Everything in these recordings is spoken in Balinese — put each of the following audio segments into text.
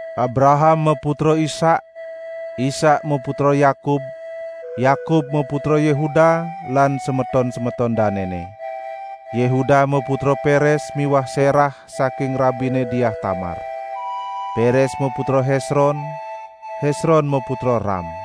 Abraham maputra Ishak, Ishak maputra Yakub, Yakub maputra Yehuda lan semeton-semeton danene. Yehuda maputra Peres miwah Serah (saking rabine Diah Tamar). Peres maputra Hesron, Hesron maputra Ram.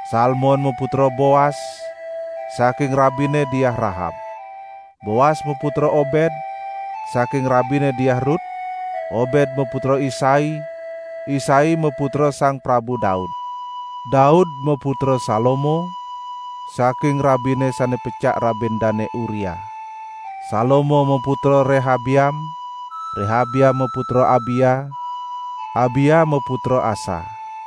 Salmon maputra Boas (saking rabine Diah Rahab). Boas maputra Obed (saking rabine Diah Rut), Obed maputra Isai, Isai maputra Sang Prabu Daud. Daud maputra Salomo (saking rabine sane pecak rabin Dane Uria). Salomo maputra Rehabeam, Rehabeam maputra Abia, Abia maputra Asa.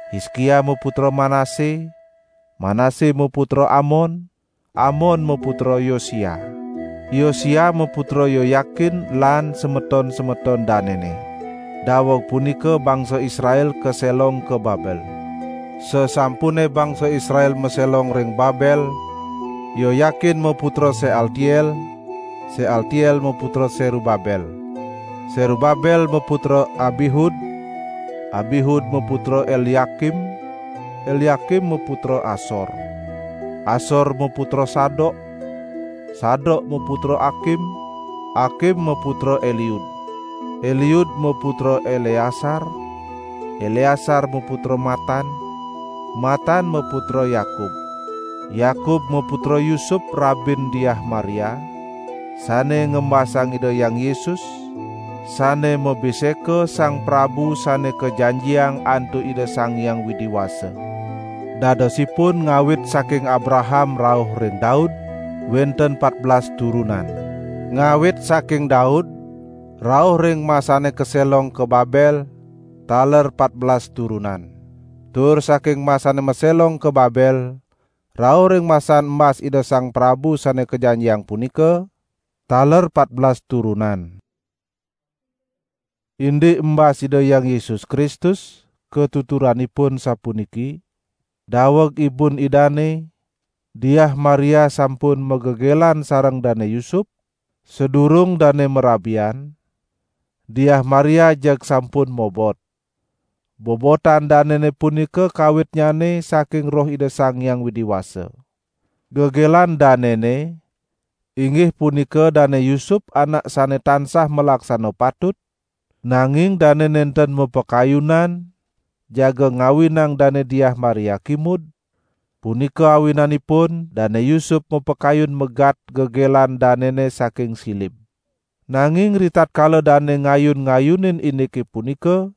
Hiskia maputra Manase, Manase maputra Amon, Amon maputra Yosia. Yosia maputra Yoyakin lan semeton-semeton danene. Daweg punika bangsa Israel kaselong ka Babel. Sasampune bangsa Israel maselong ring Babel, Yoyakin maputra Sealtiel, Sealtiel maputra Serubabel. Serubabel maputra Abihud, Abihud maputra Elyakim, Elyakim maputra Asor. Asor maputra Sadok, Sadok maputra Akim, Akim maputra Eliud. Eliud maputra Eleasar, Eleasar maputra Matan, Matan maputra Yakub. Yakub maputra Yusup rabin Diah Maria, sane ngembasang Ida Hyang Yesus sane mabiseka Sang Prabu Sane Kajanjiang antuk Ida Sang Hyang Widi Wasa. Dadosipun ngawit saking Abraham rauh ring Daud, wenten patbelas turunan. Ngawit saking Daud, rauh ring masane kaselong ka Babel taler patbelas turunan. Tur saking masane maselong ka Babel rauh ring masan embas Ida Sang Prabu Sane Kajanjiang punika, taler patbelas turunan. Indik embas Ida Hyang Yesus Kristus katuturanipun sapuniki: Daweg ibun Idane, Diah Maria sampun magegelan sareng Dane Yusup, sadurung dane marabian, Diah Maria jeg sampun mobot. Bobotan danene punika kawitnyane saking Roh Ida Sang Hyang Widi Wasa. Gegelan danene, inggih punika Dane Yusup anak sane tansah malaksana patut, nanging dane nenten mapakayunan jaga ngawinang Dane Diah Maria kimud, punika awinanipun Dane Yusup mapakayun megat gegelan danene saking silib. Nanging ritatkala dane ngayun-ngayunin indike punika,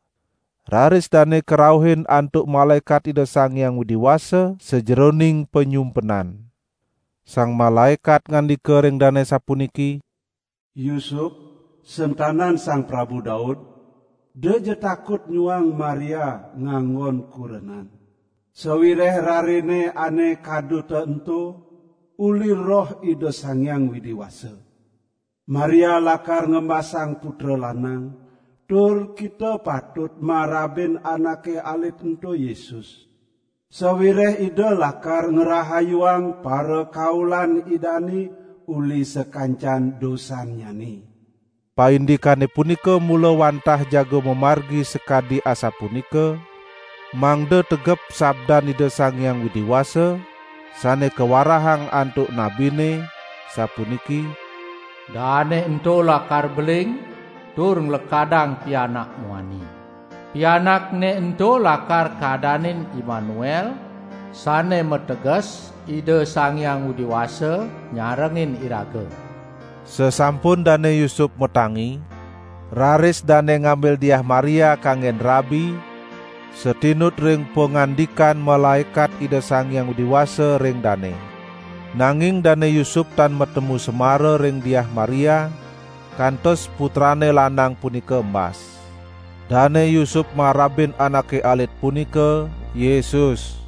raris dane karauhin antuk malaekat Ida Sang Hyang Widi Wasa sajeroning panyumpenan. Sang malaekat ngandika ring dane sapuniki: "Yusup sentanan Sang Prabu Daud, edaja takut nyuang Maria nganggon kurenan, sawireh rarene ane kaduta ento, uli Roh Ida Sang Hyang Widi Wasa. Maria lakar ngembasang putra lanang, tur kita patut marabin anake alit ento Yesus, sawireh Ida lakar ngrahayuang parakaulan Idane uli sakancan dosannyane." Paindikane punika mula wantah jaga mamargi sakadi asapunika, mangda tegep sabdan Ida Sang Hyang Widi Wasa sane kawarahang antuk nabine, sapuniki: "Daane ento lakar beling tur nglekadang pianak muani. Pianakne ento lakar kadanin Immanuel" (sane mateges: Ida Sang Hyang Widi Wasa nyarengin iraga). Sasampun Dane Yusup matangi, raris dane ngambil Diah Maria, kanggen rabi satinut ring pangandikan malaekat Ida Sang Hyang Widi Wasa ring dane. Nanging Dane Yusup tan matemu semara ring Diah Maria kantos putrane lanang punika embas. Dane Yusup marabin anake alit punika "Yesus".